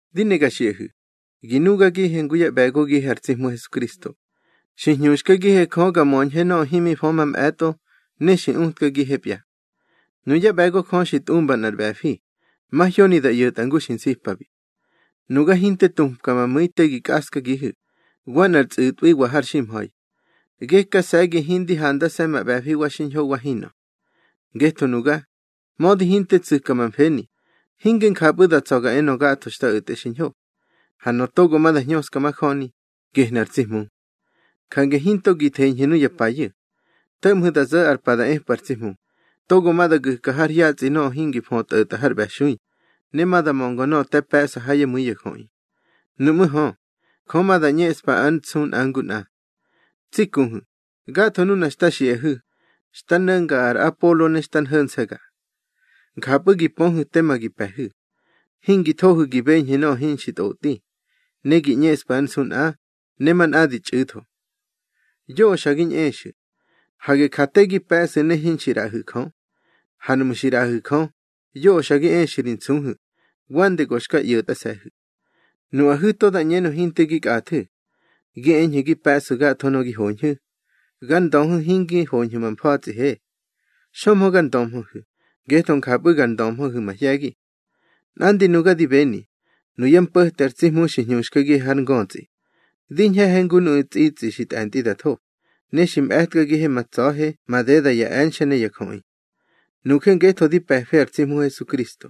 Di ne ga xiꞌahu̱, gi nugagihe ngu yá ꞌbe̱gogihe ar tsi Hmu Hesukristo; xi hñuxkagihe Jö ga möñhe nöꞌö himi fö mamꞌe̱tꞌo ne xi utkagihepya. Nuyá ꞌbe̱go Jö xi tꞌumba nꞌar ꞌbe̱fi, mahyoni da ꞌyo̱tꞌa ngu xi nsipabi. Nuga hinte tupka ma mu̱i te gi kꞌaskagihu̱, wa nꞌar tsꞌu̱tꞌwiwa har ximha̱i. Gekase̱gi hindi handase̱ ma ꞌbe̱fi wa xiñho wa hinꞌö. Ngetho nuga, mödi hinte tsu̱ka ma mfeni, hinge njapꞌu̱ da tsa̱ ga enö gatho xta o̱tꞌe xiñho. Ha nöꞌö togo ma da hñöska majöni, gehnu̱ ar tsi Hmu. Jange hinto gi theñhu̱ nuya payu̱. To̱ꞌmhu̱ da zo̱ ar pa da epꞌu̱ ar tsi Hmu, togo ma da gu̱ka har hyatsꞌi nöꞌö hingi födi tꞌo̱tꞌa har ꞌbe̱xui, ne ma da mönga nöꞌö te pe̱ꞌsa ha yá mu̱i ya jöꞌi. Nuꞌmú̱ hö, Jö ma da ꞌñeꞌspa ár nsu nꞌa ngu nꞌa. Tsi kuhu̱, gatho nuna xta xiꞌahu̱, xta no̱nga ar Apolo ne xta nho̱nse̱ga. Njapꞌu̱ gi pöhu̱ tema gi pe̱hu̱. Hingi thohu̱ gi beñhu̱ nöꞌö hinxi tꞌotꞌi, ne gi ꞌñeꞌsfu̱ ár nsu nꞌa, ne manꞌa di txꞌu̱tho. Yoꞌö xa gi ñꞌexu̱. Hage ja te gi pe̱ꞌsu̱ ne hinxi ꞌraꞌahu̱ Jö. Ha nuꞌmu̱ xi ꞌraꞌahu̱ Jö, yoꞌö xa gi exu̱ ri nsuhu̱, wande go xka ꞌyo̱tꞌase̱hu̱. Nuꞌahu̱ to da ꞌñenö hinte gi kꞌathu̱. Gi eñhu̱ gi pe̱ꞌsu̱ gatho nöꞌö gi hoñhu̱, gar ndöhu̱ hingi hoñhu̱ ma mfa̱tsꞌihe. Xömhö gar ndömhöhu̱, ngetho njapꞌu̱ nga ndömhöhu̱ mahye̱gi. Nꞌandi nuga di beni, nuyá mpo̱te ar tsi Hmu xi hñuxkagihe har ngötsꞌi. Di ñhe̱he ngu nuꞌu̱ tsꞌitsꞌi xi tꞌe̱ntꞌi da tho, ne xi mꞌe̱tkagihe ma tsa̱he madeda ya e̱nxe̱ ne ya jöꞌi. Nuje ngetho di pe̱fe ar tsi Hmu Hesukristo,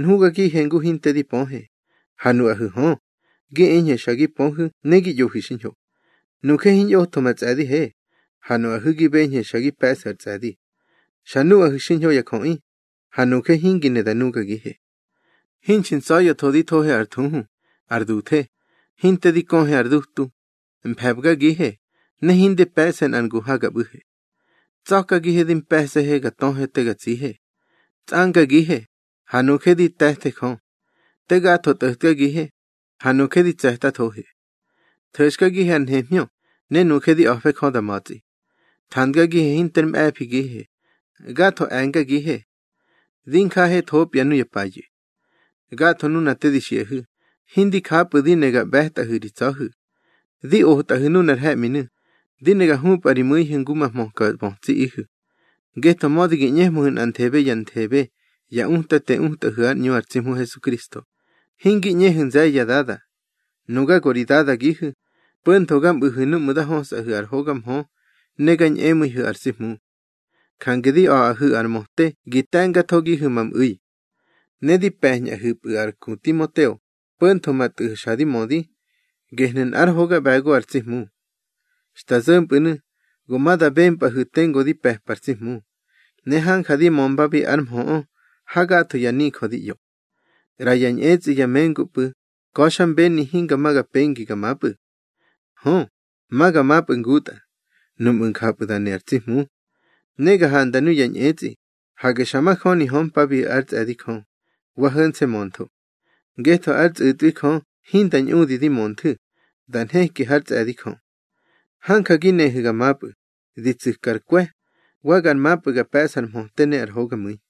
nhugagihe ngu hinte di pöhe, ha nuꞌahu̱ hö, gi eñhu̱ xa gi pöhu̱ ne gi ꞌyohu̱ xiñho. Nuje hiñꞌotho ma tsꞌe̱dihe, ha nuꞌahu̱ gi beñhu̱ xa gi pe̱ꞌsu̱ ar tsꞌe̱di. Xa nuꞌahu̱ xiñho ya jöꞌi, ha nuje hingi ne da nugagihe. Hinxi ntsa̱ya̱tho di thohe ar thuhu, ar duthe, hinte di köhe ar dutu, mfe̱bgagihe, ne hindi pe̱ꞌse nꞌar ngu ha ga ꞌbu̱he. Tsa̱kagihe di mpe̱se̱he ga töhe te ga tsihe. Tsꞌangagihe, ha nuje di te̱the Jö. Te gatho tꞌo̱tkagihe, ha nuje di tse̱tathohe. Tho̱xkagihe ar nhemhñö, ne nuje di a̱fe Jö da ma̱tsꞌi. Thandgagihe hinter mꞌe̱figihe, gatho e̱ngagihe. Di njahethopya nuya payu̱. Gatho nuna te di xiꞌahu̱, hindi japꞌu̱ di ne ga ꞌbe̱tꞌahu̱ ri tsa̱hu̱. Di otꞌahu̱ nunar he̱ꞌminu̱, di ne ga hupꞌa ri mu̱ihu̱ ngu ma hmöka bötsiꞌihu̱. Ngetho mödi gi ꞌñehmöhu̱ nꞌanthebe ya nthebe ya utate utꞌahu̱ ár ꞌñu ar tsi Hmu Hesukristo, hingi ꞌñehu̱ nze̱ye̱ ya dada. Nuga go ri dadagihu̱, po̱ntho ga mꞌu̱hu̱ núꞌmu̱ nda hösꞌahu̱ ar hoga mhö ne ga ñꞌemu̱ihu̱ ar tsi Hmu. Jange di a̱ꞌahu̱ ar möte gi te̱mgathogihu̱ ma mꞌu̱i. Ne di pe̱ñꞌaꞌihu̱pꞌu̱ ar ku Timoteo, po̱ntho ma tꞌu̱ xa di mödi, gehnu̱ nꞌár hoga ꞌbe̱go ar tsi Hmu. Xta zo̱mpꞌu̱nu̱ go ma da bempꞌahu̱ tengu di pe̱pa ar tsi Hmu, ne hanja di mömbabi ár mhöꞌö ha gatho ya nijö di ꞌyo. ꞌRaya ñꞌetsꞌi ya mengupꞌu̱ ka̱xmbeni hinga ma ga pengi ga mapꞌu̱. Hö, ma ga mapꞌu̱ ngutꞌa, nuꞌmu̱ njapꞌu̱ da ne ar tsi Hmu. Ne ga handa nuya ñꞌetsꞌi, hage xa majöni hömpabiꞌu̱ ár tsꞌe̱di Jö, wa ho̱nse̱ möntho. Ngetho ár tsꞌu̱tꞌwi Jö hinda ñꞌudi di mönthu̱, da nheki hár tsꞌe̱di Jö. Hanja gi nehu̱ ga mapꞌu̱, di tsu̱kar kwe̱, wa gar mapꞌu̱ gar pe̱ꞌsa ar mhöte ne ar hogamu̱i.